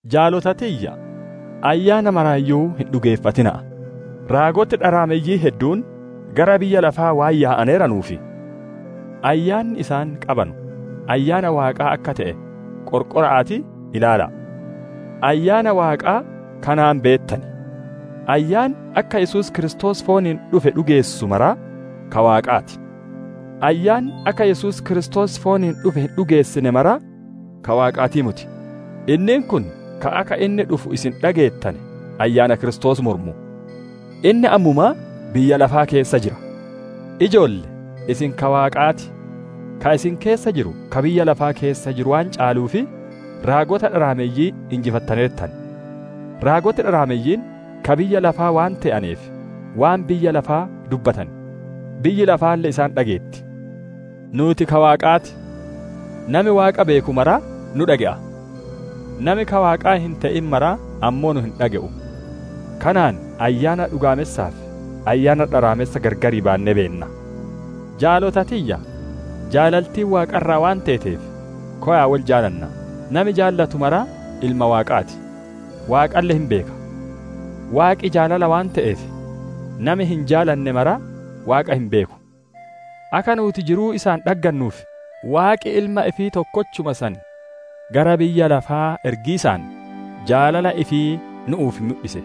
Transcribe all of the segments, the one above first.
Jaalota tiyya! Ayyaana maraayyuu hin dhugeeffatina'a; raagoti dharaameyyiin hedduun gara biyya lafaa waan yaa'aneeranuuf, ayyaanni isaan qabanu Ayyaana Waaqaa akka te'e qorqora'aatii ilaala'a. Ayyaana Waaqaa kanaan beettan: Ayyaanni akka Yesuus Kiristoos fooniin dhufe dhugeessu maraa ka Waaqaa ti; ayyaanni akka Yesuus Kiristoos fooniin dhufe hin dhugeessine maraa ka Waaqaatii moti; inniin kun ka akka inni dhufu isin dhageettane, ayyaana Kiristoos mormu. Inni ammumaa biyya lafaa keessa jira. Ijoolle! Isin ka Waaqaati; ka isin keessa jiru ka biyya lafaa keessa jiru waan caaluuf, raagota dharaameyyii injifattaneertan. Raagoti dharaameyyiin ka biyya lafaa waan te'aneef, waan biyya lafaa dubbatan, biyyi lafaalle isaan dhageetti. Nuuti ka Waaqaa ti. Nami Waaqa beeku maraa nu dhage'a; nami ka Waaqaa hin te'in mara ammoo nu hin dhage'u. Kanaan Ayyaana dhugaamessaa fi ayyaana dharaamessa gargar baannee beenna. Jaalota tiyya! Jaalaltiin Waaqa irraa waan teeteef, kowa'a wol jaalannaa! Nami jaalatu maraa ilma Waaqaa ti, Waaqalle hin beeka. Waaqi jaalala waan te'eef nami hin jaalanne maraa, Waaqa hin beeku. Akka nuuti jiruu isaan dhaggannuuf, Waaqi Ilma ifii tokkochuma san gara biyya lafaa ergiisaan, jaalala ifii nu'uuf mudhise.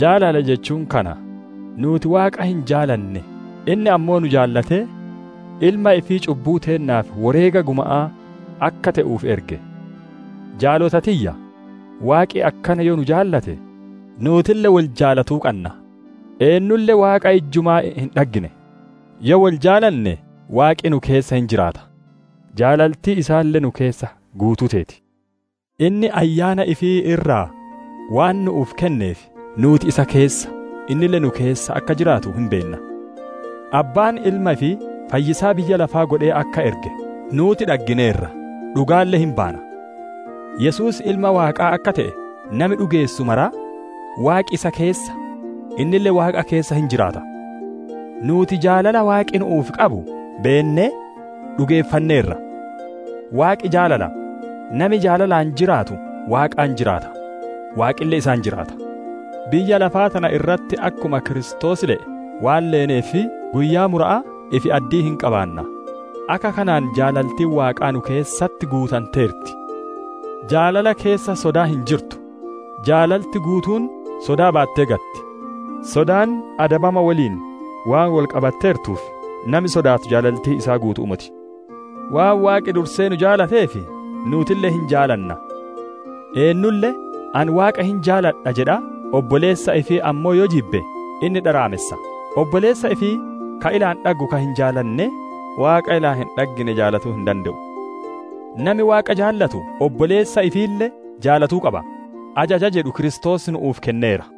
Jaalala jechuun kana: nuuti Waaqa hin jaalanne, inni ammoo nu jaalatee, Ilma ifii cubbuu teennaaf woreega guma'aa akka te'uuf erge. Jaalota tiyya! Waaqi akkana yoo nu jaalate, nuutille wol jaalatuu qanna. Eennulle Waaqa ijjumaa hin dhaggine; yoo wol jaalanne Waaqi nu keessa hin jiraata, jaalaltiin isaalle nu keessatti guutuu teeti. Inni Ayyaana ifii irraa waan nu'uuf kenneef, nuuti isa keessa, innille nu keessa akka jiraatu hin beenna. Abbaan Ilma ifii Fayyisaa biyya lafaa godhee akka erge nuuti dhaggineerra, dhugaalle hin baana. Yesuus Ilma Waaqaa akka te'e nami dhugeessu maraa, Waaqi isa keessa, innille Waaqa keessa hin jiraata. Nuuti jaalala Waaqi nu'uuf qabu beennee, dhugeeffanneerra. Waaqi jaalala; nami jaalalaan jiraatu Waaqaan jiraata, Waaqille isaan jiraata. Biyya lafaa tana irratti akkuma Kiristoos le'e waan leeneef guyyaa mura'aa ifi-addii hin qabaanna; akka kanaan jaalaltiin Waaqaa nu keessatti guutanteerti. Jaalala keessa sodaan hin jirtu; jaalaltiin guutuun sodaa baattee gatti; sodaan adabama woliin waan wol qabatteertuuf, nami sodaatu jaalaltiin isaa guutu'uu moti. Waan Waaqi dursee nu jaalateef nuutille hin jaalanna. Eennulle «Ani Waaqa hin jaaladha» jedhaa, obboleessa ifii ammoo yoo jibbe, inni dharaamessa; obboleessa ifii ka ilaan dhaggu ka hin jaalanne, Waaqa ilaan hin dhaggine jaalatuu hin dande'u. Nami Waaqa jaalatu, obboleessa ifiille jaalatuu qaba, ajaja jedhu Kiristoos nu'uuf kenneera.